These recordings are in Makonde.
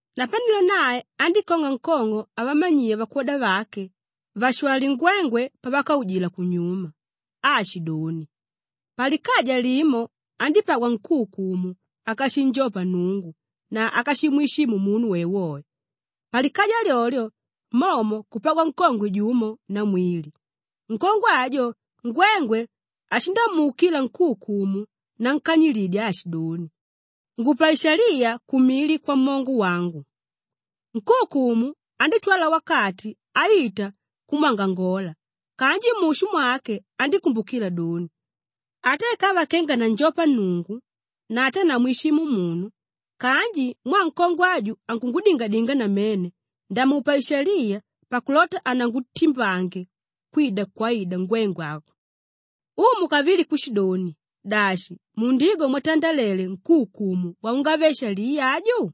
Napanelo nae andíkong'a nkong'o avamanyiya vakwoda vake vashwalye ngwengwe pavakaujila kunyuma aashidoni, “Palikaja limo andípagwa nkúukumu ákashinjopa Nnungu na ákashimwishimu munu woewoe. Palikaja lyolyo momo kupagwa nkongwe jumo namwili; nkongwe ajo ngwengwe ashindamuukila nkúukumu nankanyilidya aashidoni, ‘Ngupa ishaliya kumili kwamongo wangu.’ Nkúukumu andítwala wakati aita kumwangangola kanji mushu mwake andíkumbukila doni, ‘Ata ikava kenga nanjopa Nnungu na ata namwishimu munu kanji mwaa nkongwe aju ankungudingadinga namene, ndamupa ishaliya pakulota hanangutimbange kwida kwaida ngwengwe aku.’” Umu kavili kushidoni, “Dashi, mundigwa mwatandalele nkúukumu waungave-shaliya aju?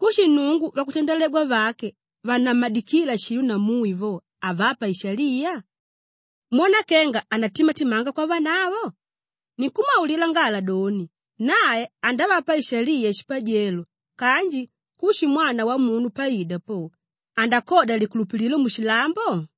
Kushi Nnungu vakutandalegwa vake vannamadikíla shilo na mui vo, havapa ishaliya? Mwona kenga andatimatimanga kwavanavo? Ninkumwaulila ngala doni, nae andavapa ishaliya shipajelo kanji kushi Mwana Wamunu paida po, andakodya likulupililo mushilambo?”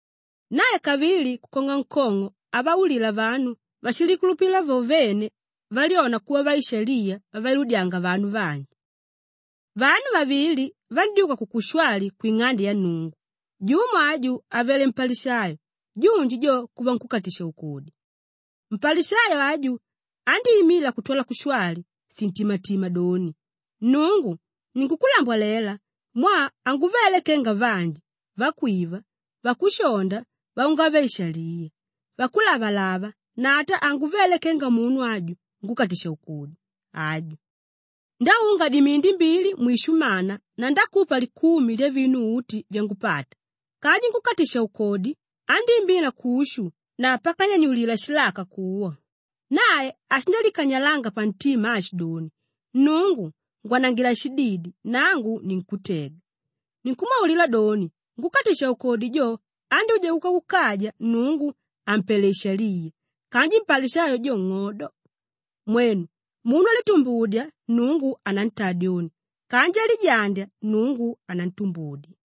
Nae kavili kukong'a nkong'o avaulila vanu váshilikulupila vo vene valyona kuva vaishaliya vavailudyanga vanu vanji: “Vanu vavili vandyúka kukushwali kwing'ande ya Nnungu. Jumo aju avele mpalishayo junji jo kuva nkúkatisha-ukodi. Mpalishayo aju andíimila kutwala kushwali shintimatima doni, ‘Nnungu, ninkukulambwalela mwaa hanguvele kenga vanji; vakwiva, vakushonda, vaungave-ishaliya, vakulavalava na ata hanguvele kenga munu aju nkúkatisha-ukodi aju. Ndáunga dimindi mbili mwishumana na ndákupa likumi lyavinu uti vyangupata.’ Kanji nkúkatisha-ukodi andíimila kushu na pakanyanyulila shilaka kuwa; nae ashindalikanyalanga pantima aashidoni, ‘Nnungu, ngwanangila shididi nangu ninkutega.’ Ninkumwaulila doni, nkúkatisha-ukodi jo andyúja kuka kukaja Nnungu àmpele ishaliya kanji mpalishayo jo, ng'odo. Mwenu, munu álitumbudya, Nnungu anantaa dyoni kanji álijandya, Nnngu anantumbudya.”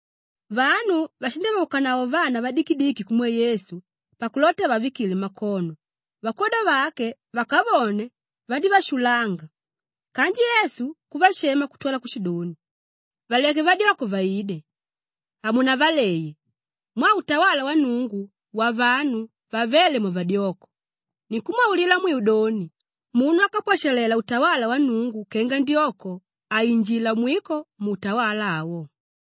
Vanu vashindavaukanavo vana vadikidiki kumwe Yesu pakulota avavikile makono; vakwoda vake vakavone vandívashulanga kanji Yesu kuvashamela kutwala kushidoni, “Valeke vadyoko vaide, hamunavaleye mwaa utawala wa Nnungu wavanu vavéle mwavadyoko. Ninkumwaulila mwiu doni, munu ákapwashalela utawala wa Nnungu kenga ndyoko, hainjila mwiko muutawala awo.”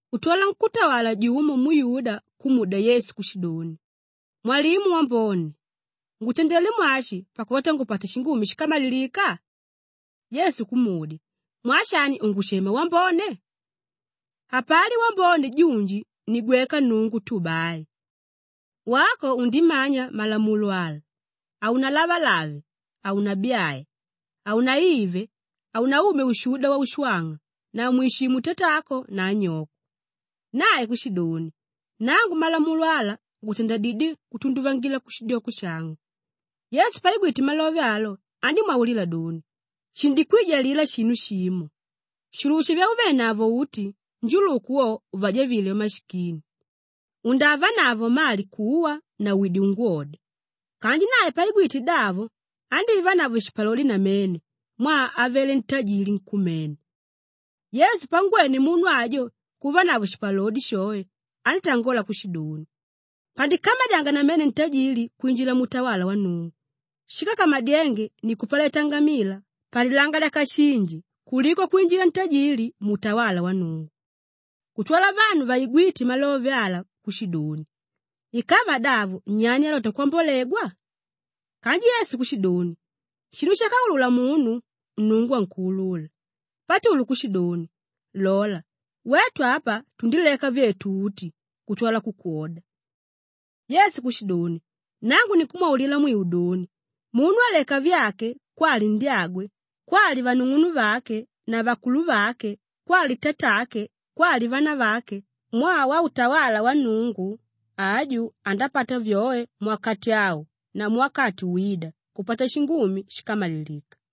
Kutwala nkútawala jumo muyuda kumudya Yesu kushidoni, “Mwalimu Wambone, ngutandelé mwashi pakulota ngupate shingumi shíkamalilika?” Yesu kumudya, “Mwaa shani ungushema wambone? Hapali wambone junji ni gweka Nnungu tu bai. Wako undimanya malamulo ala: haunalavalave, haunabyae, haunaive, haunaumye ushuda waushwang'a na mwishimu tatako na anyoko.” Nae kushidoni, “Nangu malamulo ala ngutandandidyé kutunduvangila kushidyoko shangu.” Yesu paigwite malove alo andímwaulila doni, “Shindikwijalila shinu shimo. Shulusha vyauvenavo uti, njuluku wo uvajavile vamashikini; undavanavo mali kuwa na wide ungwode.” Kanji nae paigwite davo andívanavo shipalodi namene mwaa avele ntajiili nkumene. Yesu pangwene munu ajo kuvanavo shipalodi shoe andítangola kushidoni, “Pandikamadyanga namene ntajili kwinjila muutawala wa Nnungu. Shíkakamadyenge ni kupaleta ngamila palilanga lyakashinji kuliko kwinjila ntajili muutawala wa Nnungu.” Kutwala vanu vaigwíte malove ala kushidoni, “Ikava davo nyani álota kwambolegwa?” Kanji Yesu kushidoni, “Shinu shákaulula munu, Nnungu ankuulula.” Patulu kushidoni, “Lola, wetu apa tundileka vyetu uti kutwala kukwoda.” Yesu kushidoni, “Nangu ninkumwaulila mwiu doni, munu áleka vyake kwali ndyagwe kwali vanung'unuvake na vakuluvake kwali tatake kwali vanavake mwaa wautawala wa Nnungu, aju andapata vyoe muwakati au na muwakati wída, kupata shingumi shíkamalilika.”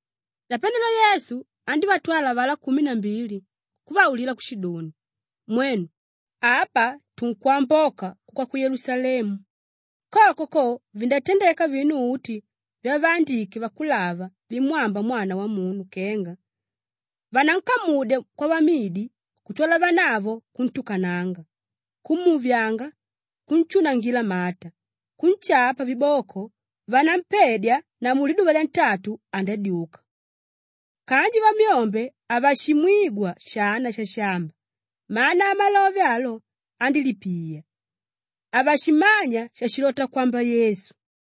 Napanelo Yesu andívatwala avalá kumi na mbili kuvaulila kushidoni, “Mwenu, apa tunkwamboka kuka ku Yelusalemu; koko ko, vindatandeka vinu uti vyavaandike vakulava vimwámba Mwana Wamunu kenga, vanankamudya kwavamidi kutwala vanavo kuntukananga, kumuvyanga, kunshunangila mata, kunshapa viboko, vanampedya na muliduva lyantatu andadyuka.” Kanji vamyombe havashimwigwa shana shashamba, mana amalove alo andílipiya; havashimanya shashilota kwamba Yesu.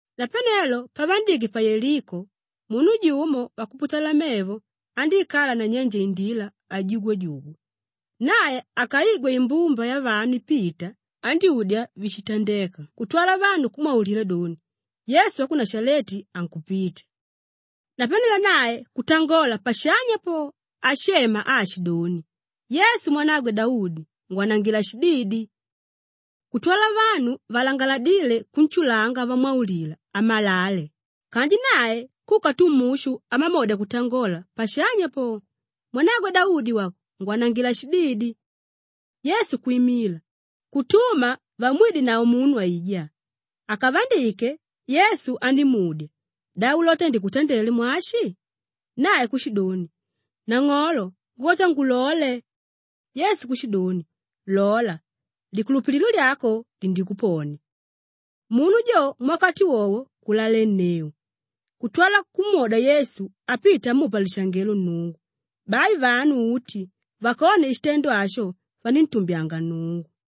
Napanelo pavandike pa Yeliko, munu jumo wakuputala mevo andíikala nanyenje indila ajugwajugwa. Nae akaigwe imbumba yavanu ipita, andyúdya víshitandeka kutwala vanu kumwaulila doni, “Yesu wa ku Nashaleti ankupita.” Napanelo nae kutangola pashanya po ashema aashidoni, “Yesu, Mwanagwe Daudi! Ngwanangila shididi!” Kutwala vanu valangaladíle kunshulanga vamwaulila amalale kanji nae kuka tu mushu amamodya kutangola pashanya po, “Mwanagwe Daudi wako! Ngwanangila shididi!” Yesu kwimila, kutuma vamwidenavo munu aijá. Akavandike, Yesu andímudya, “Da ulota ndikutandele mwashi?” Nae kushidoni, “Nang'olo, ngulota ngulole.” Yesu kushidoni, “Lola! Likulupililo lyako lindikuponia.” Munu jo muwakati wowo kulalenneu kutwala kumwoda Yesu apita amupa lishangelo Nnungu. Bai vanu uti vakone shitendo asho vaníntumbyanga Nnungu.